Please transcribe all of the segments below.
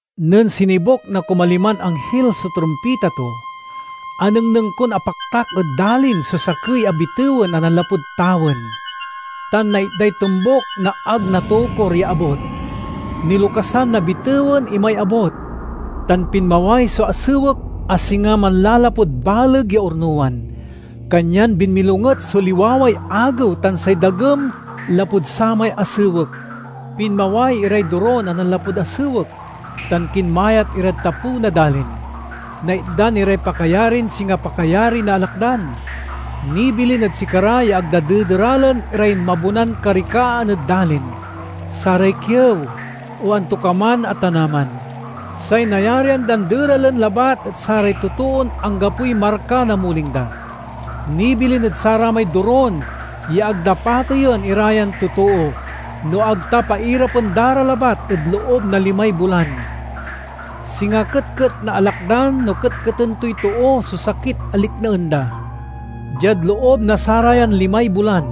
Nen sinibuk na kumaliman anghil so trumpita to, anengneng kon apaktak ed dalin so sakey a bitewen a nanlapud tawen, tan naitday tombuk na ag natokur ya abut. Nilokasan na bitewen imay abut, tan pinmaway so asewek a singa manlalapud baleg ya ornowan. Kanyan binmilonget so liwaway agew tan say dagem lapud samay asewek. Pinmaway iray dorun a nanlapud asewek tan kinmayat irad tapew na dalin. Naitdan iray pakayarin singa pakayari na alakdan. Nibilin ed sikara ya ag da dederalen iray mabonan karikaan ed dalin, saray kiew, o antokaman a tanaman. Say nayarian dan deralen labat et saray totoon anggapoy marka na muling da. Nibilin ed saramay dorun ya ag da pateyen ira yan totoo, no ag ta pairapen da ra labat ed loob na limay bulan. Singa ketket na alakdan no ketketen toy too so sakit a liknaen da. Diad loob na sarayan limay bulan,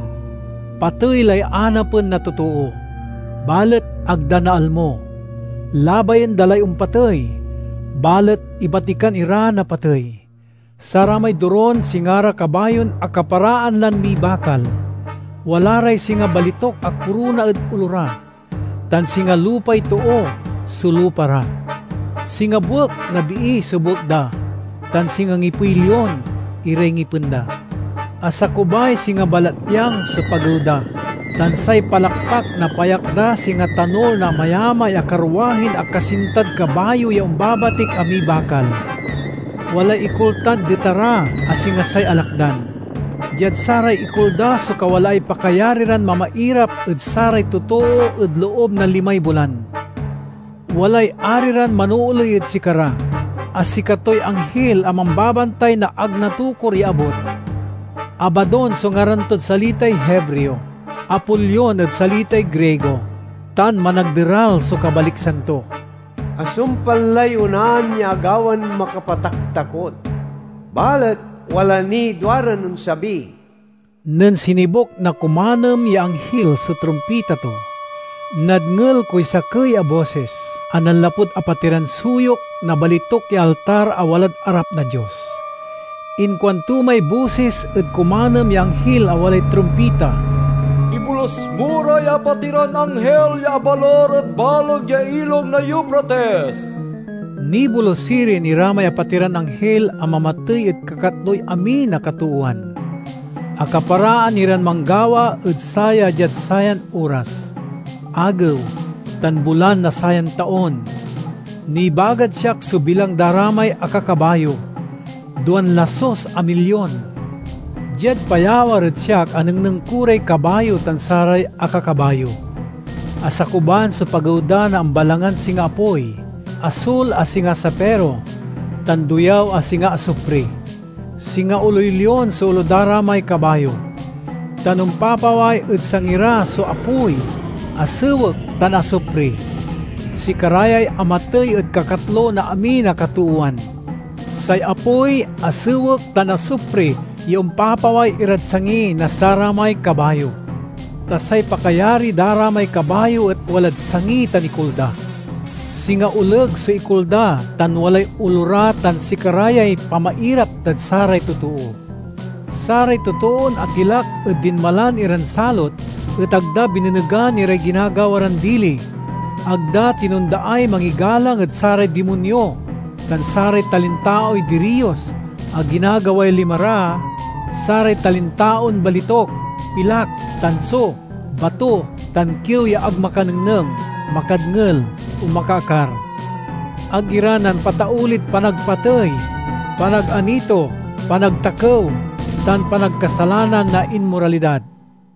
patey lay anapen na totoo, balet ag da naalmo; labayen da lay ompatey, balet ibatikan ira na patey. Saramay dorun singa ra kabayon akaparaan lan mibakal. Wala ray singa balituk a korona ed olo ra, tan singa lupay too so lupa ra. Singa buek na bii so buek da, tan singa ngipey lion iray ngipen da. Asakubay singa balatyang so pagew da, tan say palakpak na payak da singa tanul na amayamay a karwahin akasintad kabayo ya ombabatik a mibakal. Walay ikul tan dita ra, a singa say alakdan. Diad saray ikul da so kawalaay pakayari ran mamairap ed saray totoo ed loob na limay bulan. Walay ari ran manooley ed sikara, a sikatoy anghil a mambabantay na ag natokur ya abut. Abadon so ngaran tod salitay Hebreo, Apolion ed salitay Grigo, tan Managderal so kabaliksan to. Asumpal lay onaan ya agawan makapataktakot, balet wala niy duaran onsabi. Nen sinibuk na kumanem ya anghil so trumpita to, nadngel koy sakey a bosis a nanlapud apatiran suyok na balituk ya altar a walad arap na Dios. Inkuanto may bosis ed kumanem ya anghil a walay trumpita, "Ibolus mo ray apatiran anghil ya abalur ed baleg ya Ilog na Eufrates." Nibolus sirin ira may apatiran anghil a mamatey ed kakatloy amin a katoowan. Akaparaan iran manggawa ed saya diad sayan oras, agew, tan bulan na sayan taon. Nibagad siak so bilang da ra may akakabayo: duan lasus a milyon. Diad payawar ed siak anengneng ko ray kabayo tan saray akakabayo: asakuban so pagew da na ambalangan singa apoy, asul a singa safiro, tan doyaw a singa asupri. Singa oloy lion so olo da ra may kabayo, tan ompapaway ed sangi ra so apoy, asewek, tan asupri. Sikara yay amatey ed kakatlo na amin a katoowan: say apoy, asewek, tan asupri ya ompapaway irad sangi na saramay kabayo. Ta say pakayari da ra may kabayo et walad sangi tan ikul da. Singa oleg so ikul da tan walay olo ra tan sikara yay pamairap dad saray totoo. Saray totoon atilak ed dinmalan iran salot et ag da binenegan iray ginagawa ran dili. Ag da tinondaay mangigalang ed saray dimonyo tan saray talintaoy diriyos a ginagaway lima ra—saray talintaon balituk, pilak, tanso, bato, tan kiew ya ag makanengneng, makadngel, o makaakar. Ag ira nampataulid panagpatey, panaganito, panagtakew, tan panagkasalanan na inmoralidad.